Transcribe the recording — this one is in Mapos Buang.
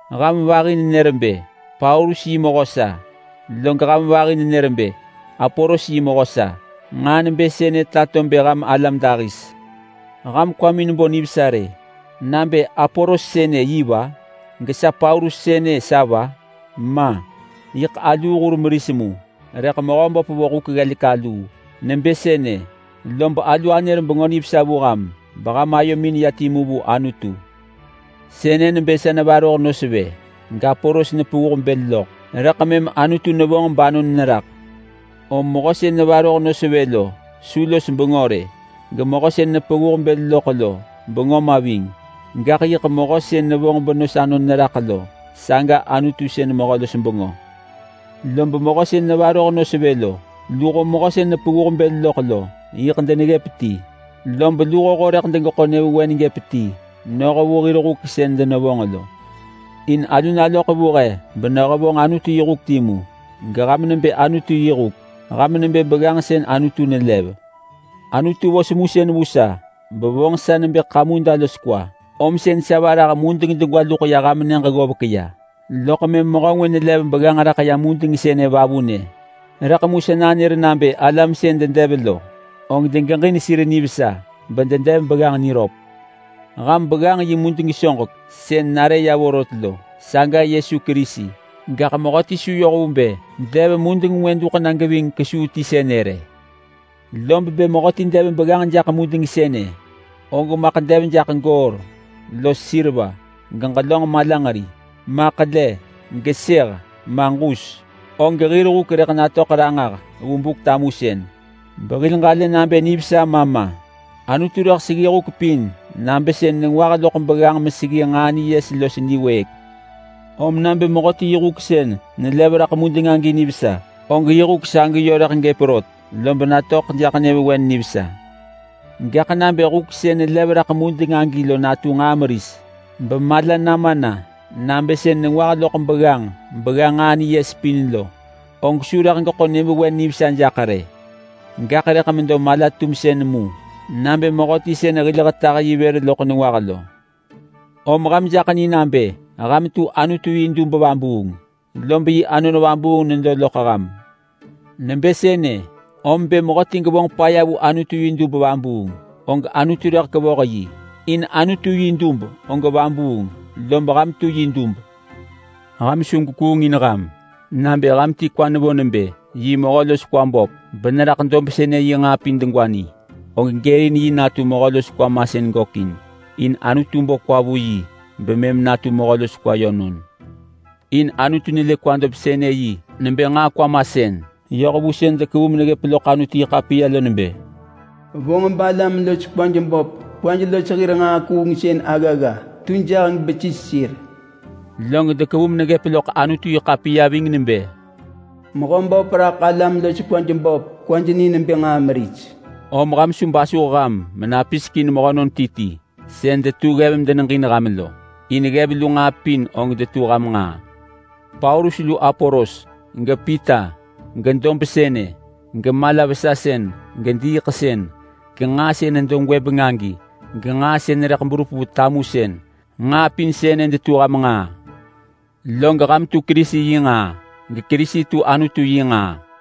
Ham vahi nenër nebë, “Paulus yi mehö sa!” Log ham vahi nenër nebë, “Apolos yi mehö sa!” Nġaa nebë sënë tato bë ham alam dahis. Ham kwamin bo nivesa rë nabë Apolos sënë yi va? Gesa Paulus sënë sa va? Ma! Yiḳ aluu hur meris mu rëḳ Mehöböp vo huk ggelek aluu. Nebë sënë lob alu anër Bengö Nivesa vu ham beham ayomin ya timu vu Anutu. Sënë nebë sa nevaroh nos vë, gApolos nepevuh bël loḳ, rëḳ mëm Anutu nevonġ banon neraḳ. Om mehö sën nevaroh nos vë lo su los bengö rë. Gemehö sën nepevuh bël loḳ lo bengö ma ving. Gaḳ yiḳ mehö sën nevonġ benos anon neraḳ lo, saga Anutu sën mehö-los-bengö. Lob mehö sën nevaroh nos vë lo luho mehö sën nepevuh bël loḳ lo yiḳ deneggëp ti. Lob luhoho rëḳ degeḳo nyëvewen doḳ ti noh vu hir huk sën denevonġ lo. In alu naloḳ vu he benehevonġ Anutu yi huk timu, geham nebë Anutu yi huk. Ham nebë begganġ sën Anutu nelev. Anutu vo semusën vu sa bevonġ sa nebë kamuda los kwa, om sën sa varah mudeng degwa luḳ ya ham nyëġ ggovek ya. Loḳ mëm mehö ngwë nelev begganġ raḳ ya mudeng sënë vavunë. Rëḳ mu sa nanër nabë alam sën dedev lo, og degeġin sir nivesa bededev begganġ niröp. Ham begganġ yi mudeng soġek sën nare ya vorot lo, saga Yesu Kerisi. Gaḳ mehöti su yoh vu bë dev mudeng ngwë duḳ na geving kesuu ti sënë rë. Lob bë mehöti dev begganġ jaḳ mudeng sënë, og maḳ dev jaḳ goor, los seriva, geġelönġ malanġeri, ma ḳele, gesëh, ma ġus, og hir huk rëḳ natöḳ ranġah vu Buk-tamusën behil ġalë nabë nivesa ma ma. Anutu rëḳ seggi huk pin nabë sën nengwah loḳ begganġ meseggi nġaa niyes los niwëëk. Om nabë mehöti yi huk sën nelev raḳ mudeng agi nivesa, og yi huk sagi yö rëḳ gëp rot, lob natöḳ jaḳ nyëvewen nivesa. Rëḳ mu nabë huk sën nelev raḳ mudeng agi lo natu nġaa meris bemala nama na nabë sën nengwah loḳ begganġ begga nġaa niyes pin lo, og su rëḳ geḳo nyëvewen nivesa jaḳ rë. Gaḳ rëḳ medo mala-tumsën mu nabë mehöti sën hil hetah yi vër loḳ nengwah lo. Om ham jaḳ ni nabë ham tu Anutu yi dub vabuung, lob yi Anon Vabuung nedo loḳ ham. Nebë sënë om bë mehöti gevonġ paya vu Anutu yi dub vabuung og Anutu rëḳ kevoh yi. In Anutu yi dub og vabuung, lob ham tu yi dub. Ham su gwekuung in ham! Nabë ham ti kwa nevo nebë yi mehö los kwa böp beneraḳ dob sënë yi nġaa pin degwa ni, og gërin yi natu mehö los kwa masën gökin in Anutu bo kwa vu yi bemëm natu mehö los kwa yönon. In Anutu nelë kwa dob-sënë-yi nebë nġaa kwa masën. Yoh vu sën dekevu meneggëp loḳ Anutu-yi-ḳapiya lo nebë, “Vonġ balam-los-kwaj-böp kwaj los hir nġaa kuungsën aggagga tu jaheng besis sir.” Log dekevu meneggëp loḳ Anutu-yi-ḳapiya ving nebë, “Mehöböp raḳ alam-los-kwaj-böp kwaj ni nebë nġaa meris.” Om ham su basuh ham menapisek in mehönon ti ti sën detu ggev medeneġin ham lo, in ggev lu nġaa pin og detu ham nġaa. Paulus lu Apolos, gePita, gedob sënë, gemala-vesasën, gediiḳsën, genġaa sën nedo gwëbeng agi, genġaa sën rëḳ berup vu tamusën. Nġaa pin sënë detu ham nġaa. Log ham tu Kerisi yi nġaa, geKerisi tu Anutu yi nġaa.